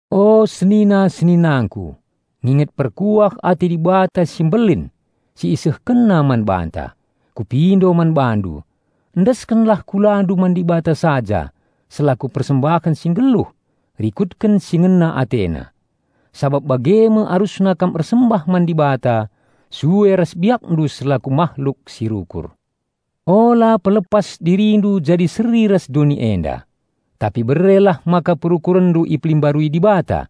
O senina-seninangku, nginget perkuah ate Dibata si mbelin si IsehkenNa man banta, kupindo man bandu: Endeskenlah kulandu man Dibata saja selaku persembahen si nggeluh rikutken si ngena AteNa. Sabap bage me arusna kam ersembah man Dibata sue ras biakndu selaku mahluk si rukur. Ula pelepas dirindu jadi seri ras doni enda, tapi berelah maka perukurenndu ipelimbarui Dibata.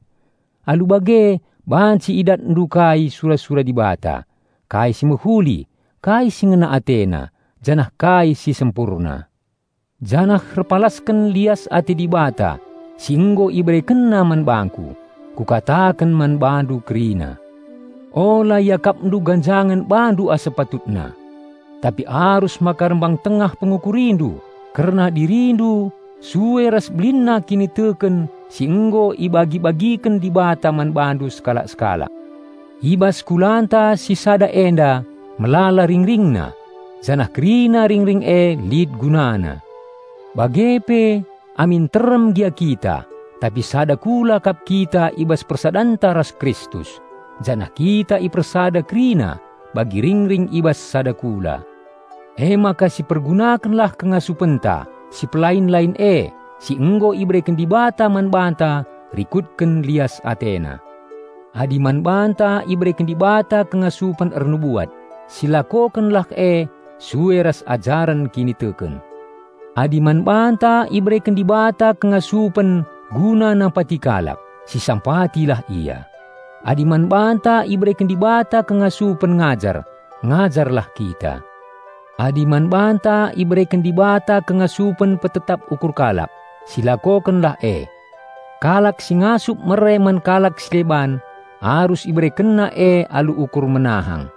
Alu bage banci idatndu kai sura-sura Dibata, kai si mehuli, kai si ngena AteNa, janah kai si sempurna. Janah erpalasken lias ate Dibata si nggo IberekenNa man bangku, kukataken man bandu kerina: Ula iakapndu ganjangen bandu asa patutna. Tapi arus maka rembang tengah pengukurindu kerna dirindu sue ras belinna kiniteken si nggo ibagi-bagiken Dibata man bandu sekalak-sekalak. I bas kulanta si sada enda melala ringringna, janah kerina ringring e lit gunana. Bage pe, amin nterem gia kita, tapi sada kula kap kita i bas persadanta ras Kristus, janah kita ipersada kerina bagi ringring i bas sada kula. Emaka sipergunakenlah kengasupenta si pelai-lain e si nggo ibereken Dibata man banta rikutken lias AteNa. Adi man banta ibereken Dibata kengasupen ernubuat, silakokenlah e sue ras ajaren kiniteken. Adi man banta ibereken Dibata kengasupen guna nampati kalak, sisampatilah ia. Adi man banta ibereken Dibata kengasupen ngajar, ngajarlah kita. Adi man banta ibereken Dibata kengasupen petetap ukur kalak, silakokenlah e. Kalak si ngasup mere man kalak si deban arus iberekenna e alu ukur menahang;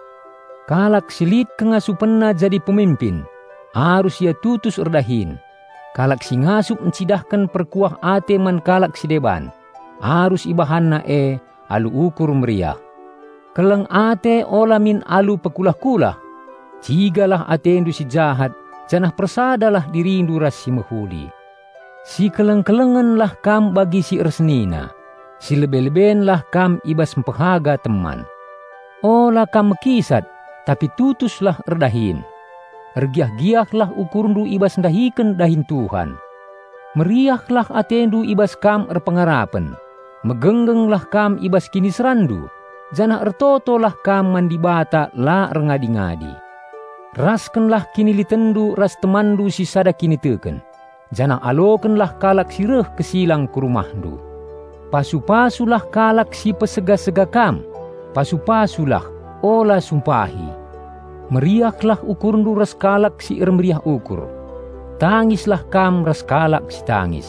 kalak si lit kengasupenna jadi peminpin, arus ia tutus erdahin; kalak si ngasup encidahken perkuah ate man kalak si deban, arus ibahanna e alu ukur meriah. Keleng ate ula min alu pekulah-kulah. Cigalah atendu si jahat janah persadalah dirindu ras si mehuli. Sikeleng-kelengenlah kam bagi si ersenina. Silebe-lebenlah kam i bas mpehaga teman. Ula kam mekisat, tapi tutuslah erdahin. Ergiah-giahlah ukurndu i bas ndahiken dahin Tuhan. Meriahlah atendu i bas kam erpengarapen, megenggenglah kam i bas kiniseranndu, janah ertotolah kam man Dibata la erngadi-ngadi. Raskenlah kinilitenndu ras temanndu si sada kiniteken, janah alokenlah kalak si reh kesilang ku rumahndu. Pasu-pasulah kalak si niksa kam, pasu-pasulah, ula sumpahi. Meriahlah ukurndu ras kalak si ermeriah ukur, tangislah kam ras kalak si tangis.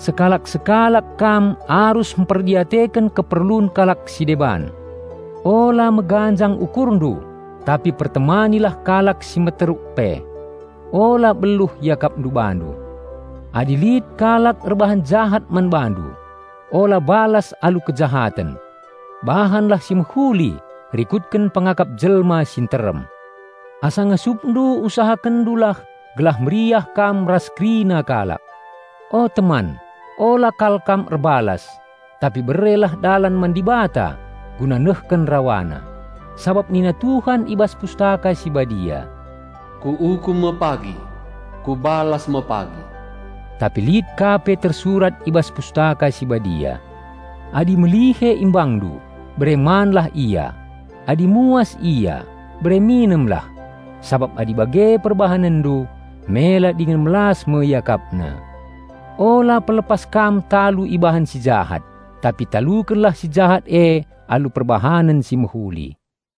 Sekalak-sekalak kam arus mperdiateken keperlun kalak si deban. Ula meganjang ukurndu, tapi pertemanilah kalak si meteruk pe. Ula beluh iakapndu bandu. Adi lit kalak erbahan jahat man bandu, ula balas alu kejahaten. Bahanlah si mehuli rikutken pengakap jelma si nterem. Asa ngasupndu usahakenndulah gelah meriah kam ras kerina kalak. O teman, ula kal kam erbalas, tapi berelah dalan man Dibata guna nehken RawaNa. Sabap nina Tuhan i bas Pustaka Si Badia, "Kuukum me pagi! Kubalas me pagi!" Tapi lit ka pe tersurat i bas Pustaka Si Badia, "Adi melihe imbangndu, bere manlah ia; adi muas ia, bere minemlah. Sabap adi bage perbahanenndu, mela dingen melas me iakapna." Ula pelepas kam talu ibahan si jahat, tapi talukenlah si jahat e alu perbahanen si mehuli.